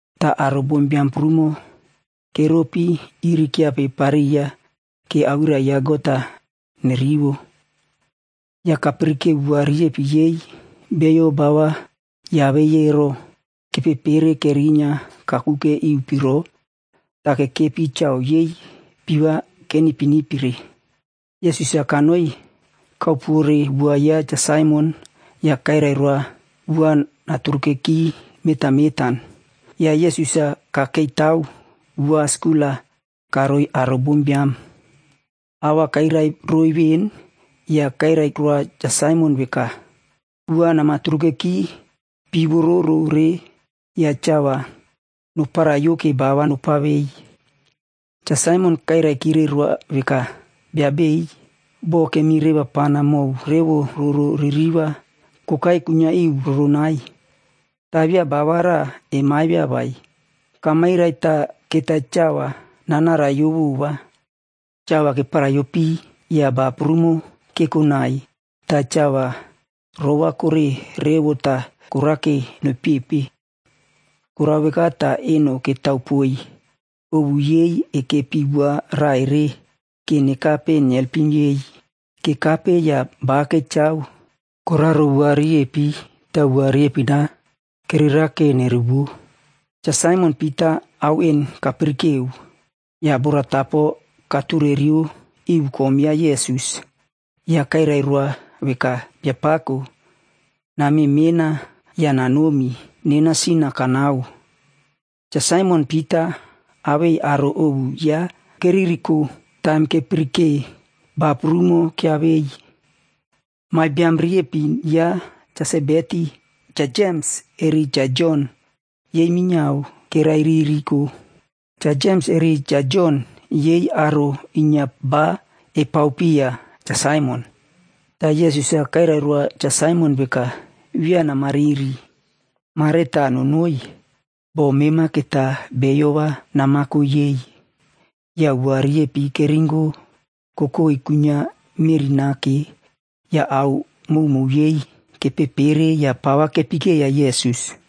ta aro bombiam prumo keropi iri kyiapepariya ke awirai ya God-a nerivo. Ya kapirikeo wua riepin yei beiyo ba va yiavei ero, kepepere kerinyia kakuke iu piro ta kekepi chao yei pii va kenipinipire. Yesus-a kanoi kararo bot ya Cha Saimon ya kairai roa bot-a naturukeki nonoi mentan mentan. Ya Yesus-a kakeitao bot skul-a karoiy aro bombiam. A va kairai roiy ven ya kairai roa Cha Saimon veka, “Bot-a namaturukeki pii vororo re ya chao va noparaiyo ke ba va nopavei.” Cha Saimon kairaikire roa veka, “Bia beiy, bo kemirevapana mow revo roro ririva kokai kuinyia iu roronai, ta via ba va raꞌa emaivia vai. Kamairai ta keta chao va nanaraiyo vova.” Chao va keparaiyo pii ya ba prumo kekonai ta chao va rovakore revo ta korake noipepe. Korao veka ta eno ketao poiy ovu yei ekepi bot raꞌa ere ke nekape nelpim yei. Kekape ya ba kechao koraro bot riepin ta bot riepin-a kererake nerevuvo. Cha Saimon Pita ao en kapirikeo, ya boratapo katureriyo iu kom ya Yesus ya kairai roa veka, “Biapako, namemena ya nanomi, nena sin-a kanao.” Cha Saimon Pita awei aro ovu yaꞌa keririko taim kepirike ba prumo kyiavei. Meꞌe biam riepin ya Cha Sebedi, Cha Jems eri Cha Jon, yei minyiao keraiririko. Cha Jems eri Cha Jon yei aro inyia ba kepao piya Cha Saimon. Ta Yesus-a kairai roa Cha Saimon veka, “Via namariri. Mare ta nonoi, bo mema keta beiyo va namako yei.” Ya bot riepin-a keringo kokoi kuinyia meꞌri nake, ya ao mowmow yei kepepere ya pa va kepekeiya Yesus.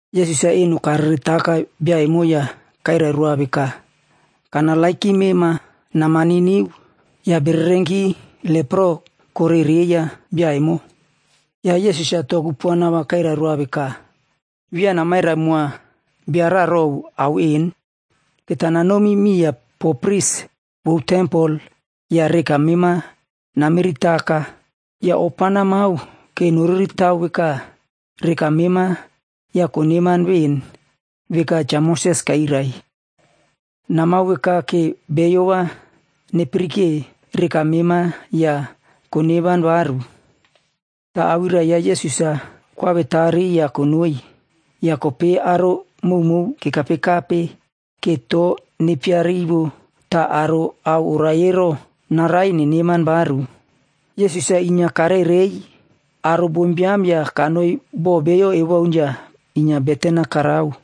Yesus-a eno kareretaka bia emo ya kairai roa veka, “Kanerenoma. Namaniniu.” Ya bererenki lepro korereiya bia emo. Ya Yesus-a to kupuana va kairai roa veka, “Via namairai moa bia raꞌa row ao en. Keta nanomi miya po pris vou tempel ya reka mema namiritaka. Ya ofa namao ke noriritao veka reka mema ya koneman ven veka Cha Moses kairai. Namao veka ke beiyo va nepirike reka mema ya koneman varu.” Ta awirai ya Yesus-a koawetari ya konoi. Ya kopei aro mowmow kekapekape ke to nepiarivo ta aro a oraie ero, naraie neneman varu. Yesus-a inyia karerei aro bombiam ya kanoi bo beiyo ewaun ya inyia beten-a karao.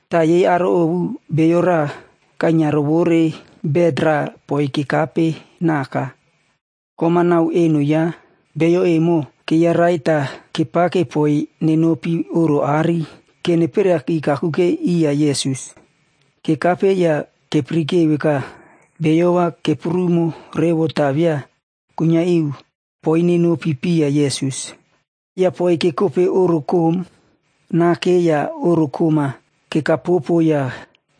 Ta yei aro ovu bio raꞌa kainyia rovore bet raꞌa poiy kekapenaka. Kom-a nau eno yaꞌa bio evo keiyarai ta kepake poiy nenopi oꞌro aꞌari ke neperiaki kakuke iya Yesus. Kekape ya kepirike veka beiyo va keprumo revo ta via kuinyia iu poiy nenopi piya Yesus. Ya poiy kekope oꞌro koꞌom nake ya oꞌro koꞌom-a kekapopo ya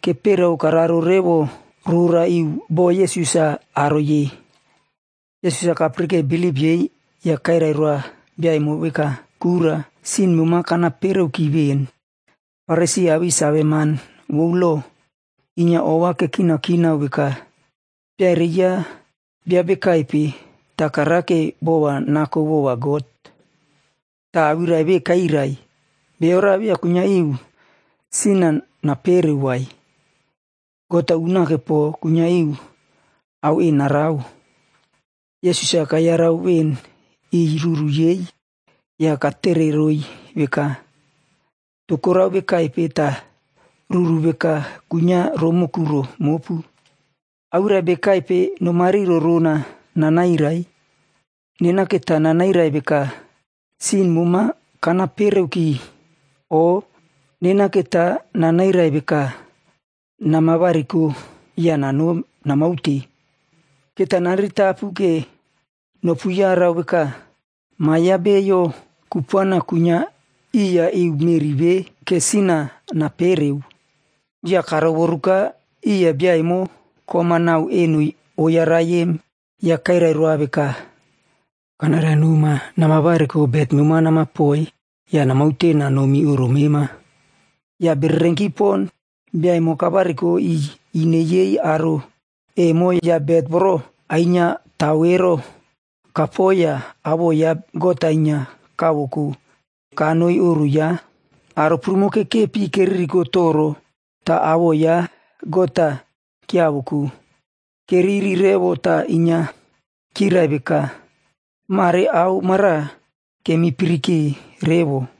keperiao kararo revo rora iu bo Yesus-a aroi em. Yesus-a kapirike bilip yei ya kairai roa bia emo veka, “Kura, sin mema kanapereoki ven.” Farisi awei saveman vou loc inyia ova kekinakinao veka, “Bia ere yaꞌa bia bekaipe ta karake bopo va nako vova God, ta awirai ve kairai? Bio raꞌa via kuinyia iu sin-a napereo vai. God-a unake po kuinyia iu sin-a napereo.” Yesus-a ruru yei kayarau ven ya katere roiy veka, “To korao vekaipe ta ruru veka kuinyia romoꞌo kuro mopu? Awirai bekaipe keta nomariro rona nanairai? Nena keta nanairai veka, ‘Sin moma kanapereoki,’ o nena keta nanairai veka, ‘Namavariko ya namaute?’ Kanerenow nopuyarau veka, Ma ya Biod kupuana kuinyia iya meꞌri ve ta kuinyia iu sin-a napereo.” Ya karovoruka iya bia emo kom-a nau eno oyarai em, ya kairai roa veka, “Kanairai noma, namavariko bet mema namako ya namaute nanomi oꞌro mema.” Ya bererenki po bia emo kavariko iꞌiy ine yei aro bombiam ya bet voro ainyiatao ero kako ya awoꞌo ya God-a inyia kavoko kaute kanoi oꞌro yaꞌa. Aro prumo kekepi keririko toro ta awoꞌo ya God-a kyiavoko. Keriri revo ta inyia kyirai veka, “Mare ao mara kemipirike revo!”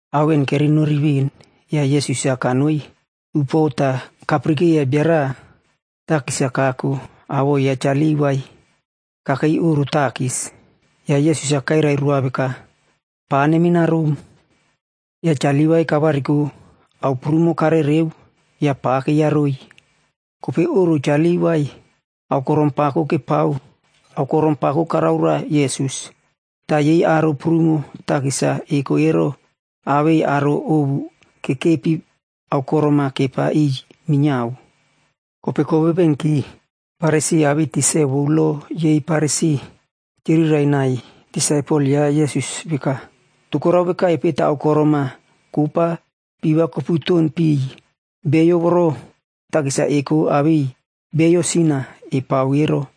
Ao en kerenori ven ya Yesus-a kanoi upuo ta kapirikeiya bio raꞌa takis-a kako awoꞌo ya Cha Livaie kakei oꞌro takis. Ya Yesus-a kairai roa veka, “Pa namenarom.” Ya Cha Livai kavariko ao prumo karereo ya pakeiyaroi. Kopei oꞌro Cha Livai, aokorom pako karao roa Yesus. Ta yei aro prumo takis-a eko awei aro ovu kekepi aokorom-a kepa piy minyiao. Kopei kovevengki Farisi awei tikse vou lo yei Farisif kyirirai nai disaipelg ya Yesus veka, “To korao vekaipe ta aokorom-a kopa pii va koputon piy beiyo takis-a eko awei beiyo sin-a epao ero?”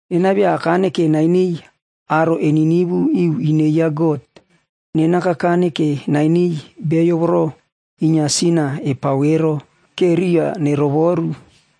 Nena via akane ke nainiy beiyo eniniu iu ine ya God. Nena kakane ke nainiy beiyo inyia sin-a epao ero ke riꞌi va nerovoru.”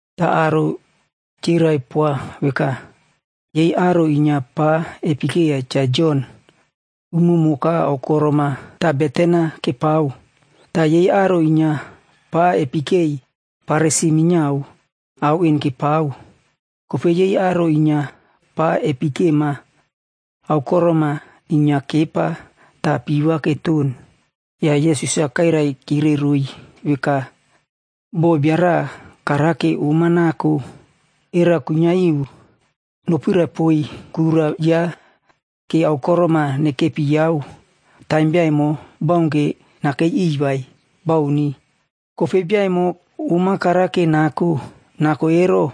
Ta aro kyirai poa veka, “Yei aro inyia pa epekeiya Cha Jon, umumoka aokorom-a kekepiyao ta beten-a kepao. Ta yei aro inyia pa epekei Farisi minyiao ao en kepao. Kopei yei aro inyia pa kepekema, aokorom-a inyia kepa ta pii va keton.” Ya Yesus-a kairaikire roiy veka, “Bo bia raꞌa karake om-a nako, era kuinyia iu nopirai poiy kura yaꞌa aokorom-a nekepiyao taim bia emo baunke nakei iꞌiy vai? Bauni. Kopei bia emo om-a karake nako ero,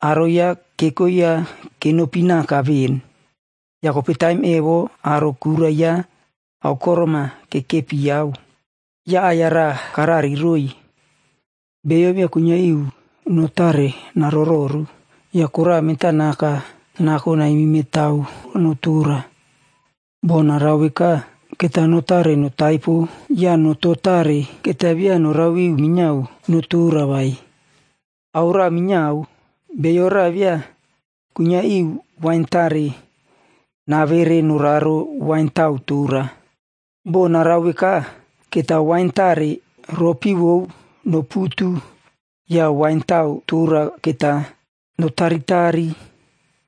aro yaꞌa keko yaꞌa kenopinaka ven, ya kopei taim emo aro kura yaꞌa aokorom-a kekepiyao.” Ya aꞌai-ya raꞌa karari roiy, “Bio via kuinyia iu no tare narororu ya koraꞌa mentanaka nako naimimetao no tora. Bo narao veka, keta no tare notaipo ya noto tare keta via norao iu minyiao no tora vai. Ao raꞌa minyiao, bio raꞌa via kuinyia iu wain tare navere noraro wain tao tora. Bo narao veka, keta wain tare ropi vou noputu ya wain tao tora keta notari.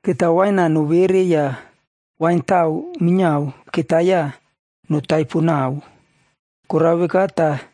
Keta wain-a novere ya wain tao minyiao keta ya notaipo nau. Korao veka ta,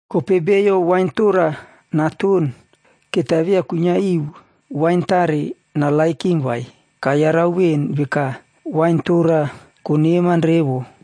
Kopei bio wain tora naton keta via kuinyia iu wain tare narererow vai. Kayarau ven veka, ‘Wain tora koneman revo.’”